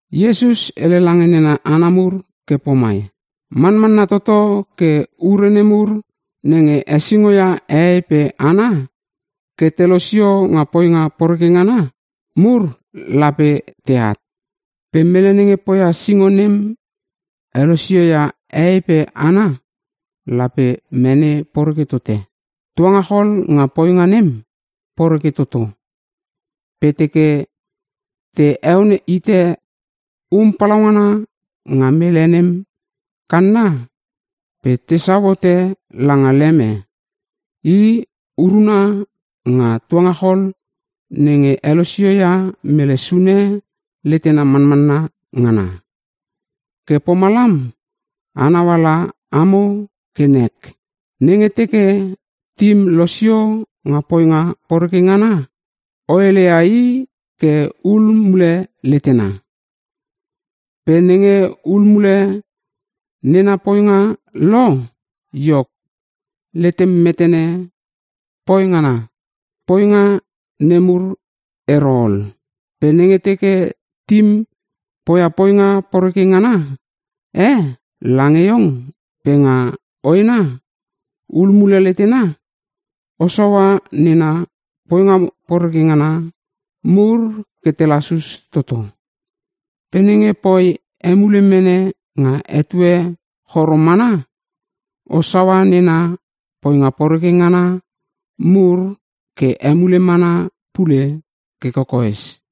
Iesus hele lange nena hana mur ke pomai, “Manmanna toto ke ure nemur nenge hesingo ia hehei pe hana ke te losio nga poinga poreke ngana mur lape teat. Pe mele nenge poia singo nem nenge helosio ia hehei pe hana lape mene poreke tote. Tuangachol nga poinga nem poreke toto. Pe teke te heon hite um palaungana nga mele nem kanna pe tesau hote langa leme i urana nga tuangachol nenge helosio ia mele sune letena manmanna ngana. Ke pomalam a nauala amo ke nek. “Nenge teke tim losio nga poinga poreke ngana o heleia i ke hul mule letena. Pe nenge hul mule nena poinga lo, iok, letem metene poi ngana nemur ero ol. Pe nenge teke tim poia poinga poreke ngana e lange iong pe nga hoena hul mule letena, o saua nena poinga poreke ngana mur ke te lasus toto. Pe nenge poi emule mene nga etue choro mana, o saua nena poinga poreke ngana mur ke emule mana pule ke kokoes.”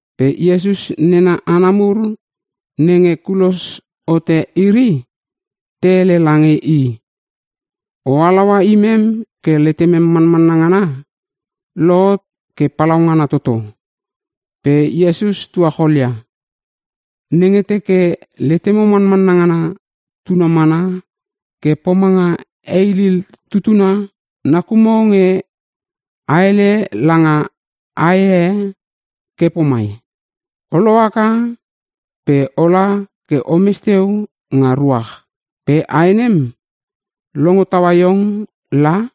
Pe Iesus nena hana mur nenge kulos hote iri te hele lange i, “O halaua imem ke letemem manmanna ngana lohot ke palaungana toto.” Pe Iesus tuacholia, “Nenge teke letemo manmanna ngana tuna mana ke pomanga heilil tutuna, nakumo nge a hele langa ae e ke pomai, ‘O laka haka pe ola ke omes teu nga ruach.’ Pe ae nem longo taua iong la.”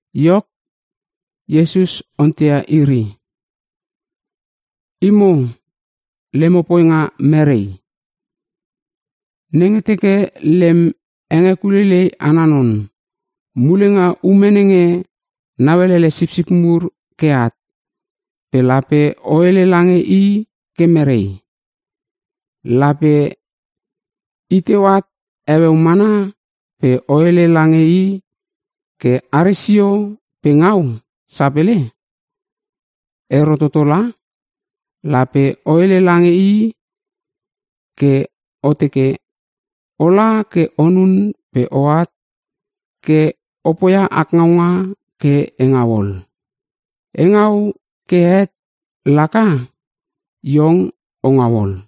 Iok, Iesus onteia iri, “Imo lemo poinga mere? Nenge teke lem hengekuleilei ana non, mule nga ume nenge nauelele sipsip mur ke at, pe lape o hele lange i ke mere? Lape iteu at heueu mana pe o hele lange i ke are sio pe ngau sapele? Ero toto la! Lape o hele lange i ke o teke, ‘Ola ke onun pe oat ke o poia ak ngaunga ke e ngau ol. E ngau ke het laka, iong o ngau ol.’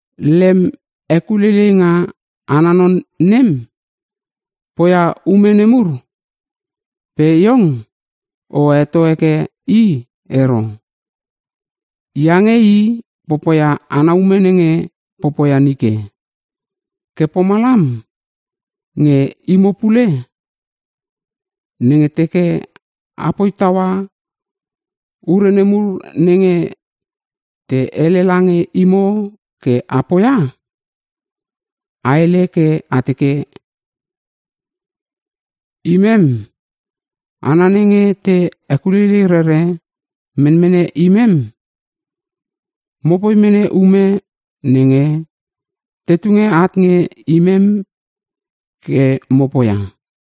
Lem hekuleileinga ana non nem, poia ume nemur pe iong o heto heke i ero. Iange i popoia ana ume nenge popoia nike. Ke pomalam nge imo pule, nenge teke apoi taua ure nemur nenge te hele lange imo ke a poia, a hele ke a teke, ‘Imem hana nenge te hekuleilei rere menmene imem. Mopoi mene ume nenge te tunge at nge imem ke mo poia.’”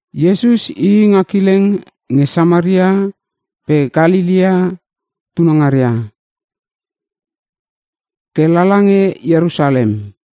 Iesus ii nga kileng nge Samaria pe Kalelea tunangaria ke lala nge Ierusalem.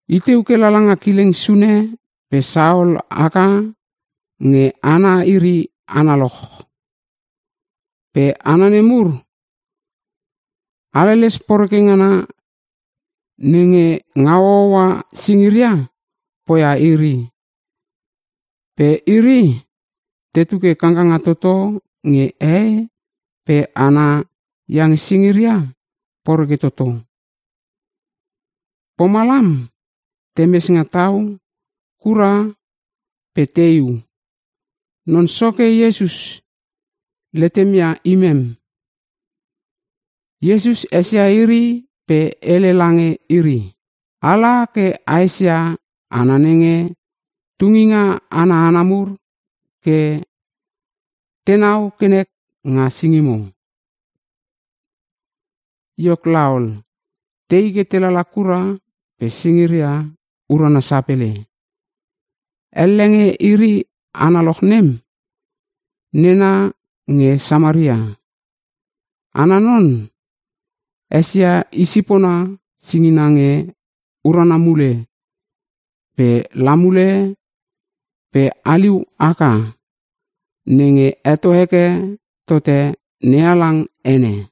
Iteu ke lala nga kileng sune pe saol haka nge hana iri analoch. Pe hana nemur haleles poreke ngana nenge ngau hooa singira poia iri. Pe iri tetu ke kangkanga toto nge hehei pe hana iange singiria poreke toto. Pomalam temes nga tau kura, pe teiu, “Non Soke Iesus, letem ia imem.” Iesus esia iri pe hele lange iri, “Ala ke a esia hana nenge tunginga ana hana mur ke tenau ke nek nga singimo.” Iok laol, tei ke te lala kura pe singiria urana sapele. Elle nge iri analoch nem nena nge Samaria. Ana non esia i sipona singina nge urana mule pe la mule pe haliu haka nenge heto heke tote NeHalang ene.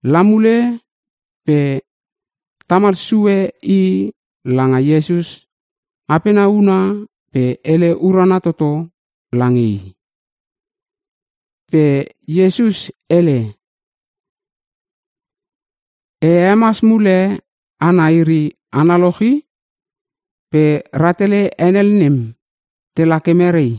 Lamule pe tamal sue i langa Iesus apena huna pe hele urana toto lange i. Pe Iesus hele, “E hemas mule hana iri analoch i, pe rahtele henel nem te lake mere?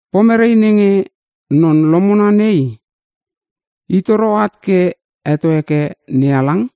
Pomere nenge non lomona nei i toro at ke heto heke NeHalang?”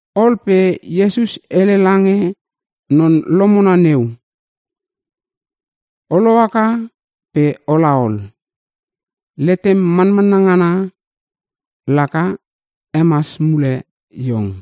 Ol pe Iesus hele lange non lomona neu, “O lohaka pe ola ol. Letem manmanna ngana laka hemas mule iong.”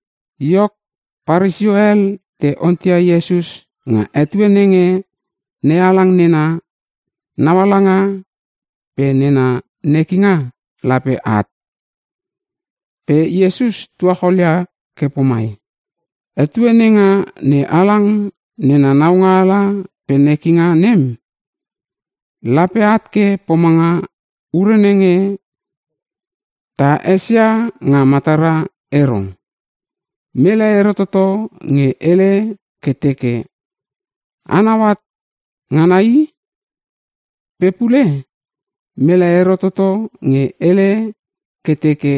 Iok, Paresio hel te onteia Iesus nga etue nenge NeHalang nena naualanga pe nena nekinga lape at. Pe Iesus tuacholia ke pomai, “Etue nenga NeHalang nena naualanga pe nekinga nem, lape at ke pomanga ure nenge ta esia nga matara ero. Mele ero toto nge hele ke teke, ‘Anau at ngana i!’ Pe pule mele ero toto nge hele ke teke,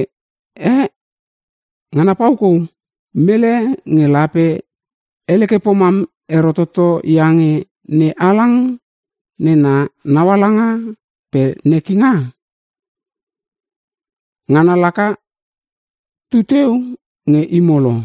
‘Eh, Ngana paukou!’ Mele nge lape hele ke pomam ero toto iange NeHalang nena naualanga pe nekinga, ngana laka tuteu nge imo lo.”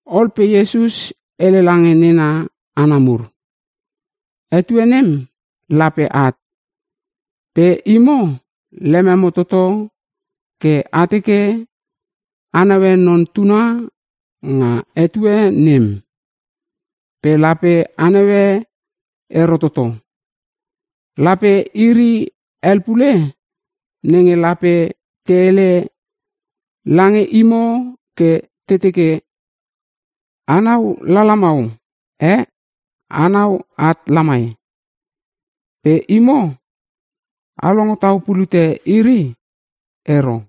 Ol pe Iesus hele lange nena hana mur, “Etue nem lape at, pe imo lememo toto ke a teke a naue Non Tuna nga etue nem. Pe lape a naue ero toto. Lape iri hel pule nenge lape te hele lange imo ke te teke, ‘Anau lala mau! Eh, anau at lamai!’ Pe imo, a longo tau pulute iri ero.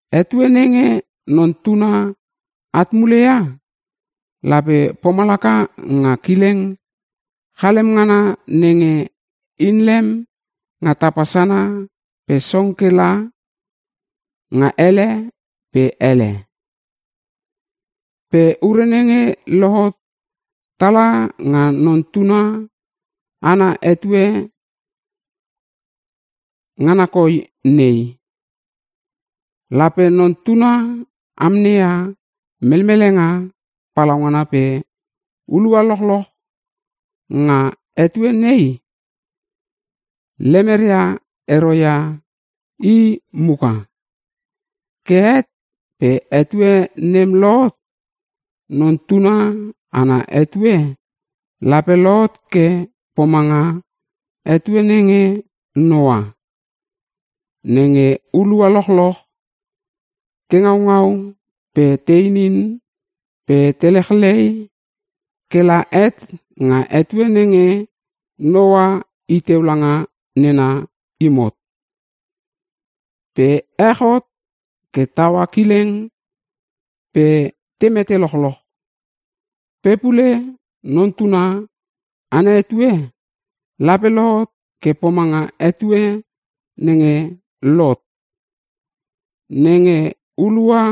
Etue nenge Non Tuna at mule ia lape pomalaka nga kileng chalem ngana nenge inlem nga tapa sana pe song ke langa ele pe ele. Pe ure nenge lohot tala nga Non Tuna ana etue ngana koi nei, lape Non Tuna amneia melmelenga palaungana pe hulua lochloch nga etue nei lemeria ero ia i mukam. Ke het pe etue nem lohot. “Non tuna ana etue lape lohot ke pomanga etue nenge Noa. Nenge hulua lochloch te ngaungau pe te inin pe te lechlei kela het nga etue nenge Noa iteu langa nena imot. Pe ech hot ke taua kileng pe te mete lochloch. “Pe pule Non Tuna ana etue lape lohot ke pomanga etue nenge Lot. Nenge hulua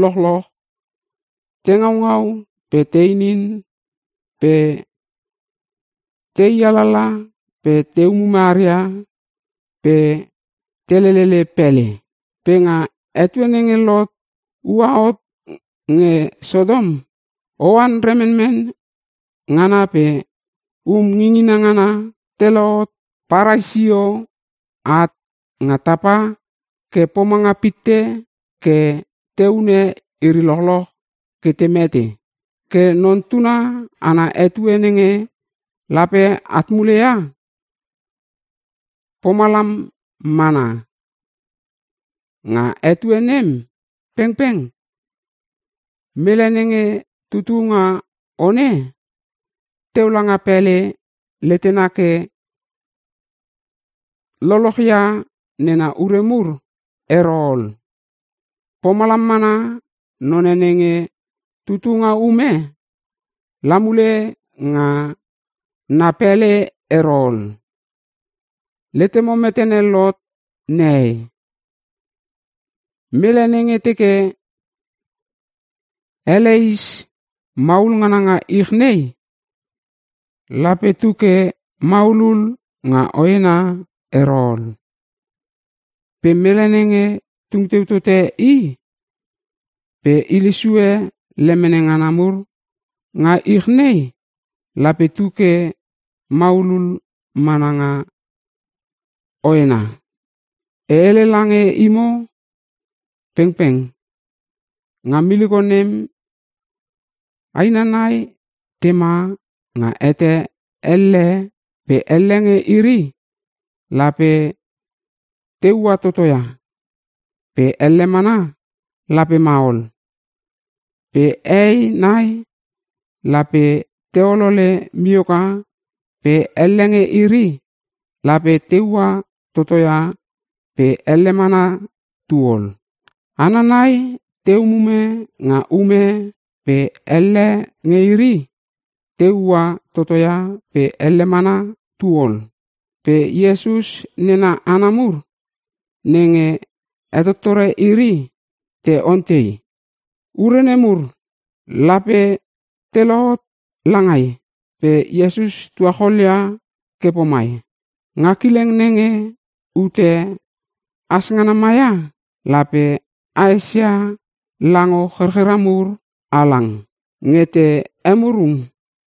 lochloch te ngaungau pe te inin pe te ialala pe te umume aria pe te lelele pele. Pe nga etue nenge Lot ua hot nge Sotom, oan remenmen ngana pe um ngingina ngana telot parai sio at nga tapa ke pomanga pitte ke te hune iri lochloch ke te mete. “Ke Non Tuna ana etue nenge lape at muleia pomalam mana. Nga etue nem pengpeng, mele nenge tutu nga one, teu langa pele letena ke lolochia nena ure mur ero ol. Pomalam mana none nenge tutu nga ume la mule nga na pele ero ol. Letemo metene Lot nehei? Mele nenge teke heleis maul ngana nga ich nei, lape tu ke maulul nga hoena ero ol. Pe mele nenge tungteu tote i, pe hile sue lemene ngana mur nga ich nei lape tu ke maulul mana nga hoena. E hele lange imo pengpeng, nga miliko nem aina nai tema nga hete elle pe elle nge iri lape te ua toto ia, pe elle mana lape ma ol. Pe hehei nai lape te olole mioka pe elle nge iri lape te ua toto ia pe elle mana tu ol. [ Hana nai te umume nga ume pe elle nge iri te ua toto ia pe elle mana tu ol.]” Pe Iesus nena hana mur nenge hetotore iri te ontei, “Ure nemur lape te lohot langai?” Pe Iesus tuacholia ke pomai, “Nga kileng nenge ute has ngana maia, lape a esia lango cherchera mur halang, nge te emurung.”